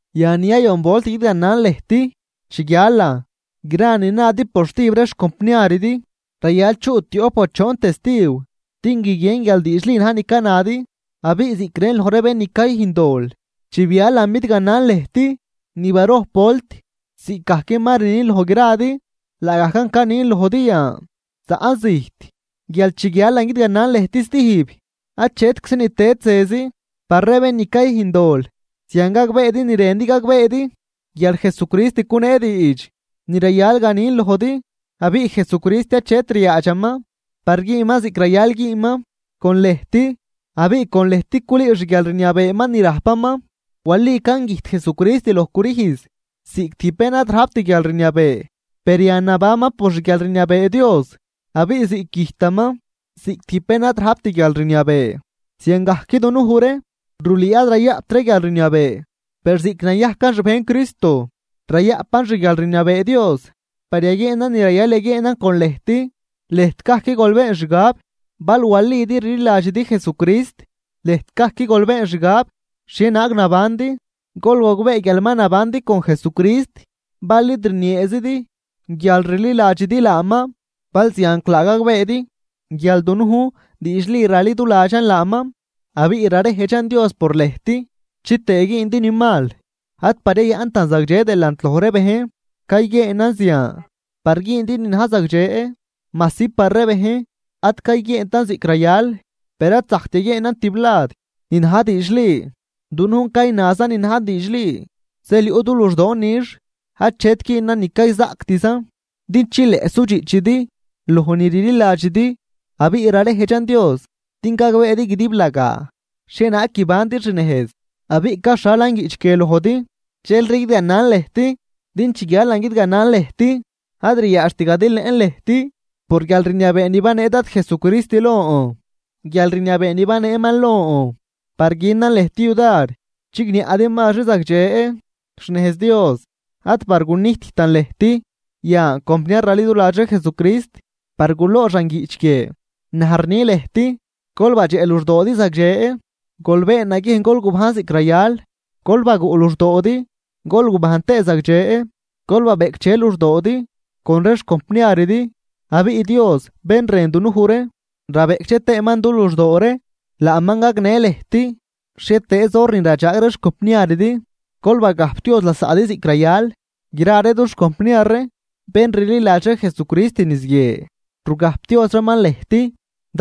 Yan ni yayon volt guidganan lëjt. Chi guialan, gra ni nadi por stijb ree xcompniaridi, rayal chuꞌ tioꞌp o choon testiw din guiguien guial diidxli na̱j ni canadi. Abiꞌ ziꞌc rën loj ree bén ni cayüjn dol chi bialan bidganan lëjt ni barojp volt ziꞌcgajc ma rnin loj gradi, laagajcan canin lojdi yan zaꞌn zijt guial chi guialan guidganan lëjt stijb, achetczi ni tëd zezi par ree bén ni cayüjn dol. Zian gagbeedi ni rëndi gagbeedi guial Jesucrist cunee diidx ni rayal ganin lojdi. Abiꞌ Jesucrist achet ryaadxaman par güünman ziꞌc rayal güünman con lëjt abiꞌ con lëjt culüü xguialrniabeeman ni rajpaman. Walican güjt Jesucrist loj crüjz ziꞌc tijb bén ad rajpt guialrniabee, per yan nabanman por xguialrniabee Dios. Abiꞌ ziꞌc güjtaman ziꞌc tijb bén ad rajpt guialrniabee ziangajc dunuj ree rulüü ad rayaꞌpt ree guialrniabee, per ziꞌc nayajcan xbejn Cristo rayaꞌpan xguialrniabee Dios par yaguieenan ni rayal yaguieenan con lëjt. Lëjt gajc gol been xgab bal walidi rliladxidi Jesucrist. Lëjt gajc gol been xgab xhienaag nabandi. Gol gogbee guial ma nabandi con Jesucrist, bal id rnieezidi guial rliladxidi laaman. Balzianclaa gagbeedi guial dunujn diidxli raliduladxan laaman. Abiꞌ rarejdxan Dios por lëjt chitëë güündi ni mal, ad par yayaꞌntan zagdxe delant loj ree bejn, cayguieenan zian par güündi ni na̱j zagdxe, majsi par ree bejn ad cayguieentan ziꞌc rayal. Per ad zajct yaguieenan tiblad ni na̱j diidxli, dunujn caynazan ni na̱j diidxli. Zeel yuꞌ du luxdoon nix achet güünan ni cayzaꞌctzan din chileꞌ sudxiꞌchidi loj ni rliladxidi. Abiꞌ rarejdxan Dios din gagbeedi guidiblagaa xhienaag guibandi xnejz. Abiꞌ caxhalan guiꞌch guie lojdi dxelri guidganan lëjt, din chi guialan guidganan lëjt ad ryaadxt gadilëꞌn lëjt por guialrniabee ni banee Dad Jesucrist lon, guialrniabee ni baneeman lon par günan lëjt yudar chigniaꞌdi mazri zagdxe xnejz Dios, ad par gunijttan lëjt. Yan compniar raliduladx ree Jesucrist par guloxan guiꞌch guie, naj rni lëjt: Gol badxeꞌ luxdoodi zagdxe, gol been naguiejn gol gubajn ziꞌc rayal, gol baguꞌ luxdoodi gol gubajn tëë zagdxe, gol babeꞌcdxe luxdoodi con ree xcompniaridi. Abiꞌ Dios bén rën dunuj ree rabeꞌcdxe tëëman du luxdoo ree laaman gagnë lëjt. Xhietëëz hor ni radxaag ree xcompniaridi, gol bagajpdioz lasaꞌdi ziꞌc rayal. Gra ree dux compniar ree bén rliladx ree Jesucrist niz guie rugajpdioz reeman lëjt.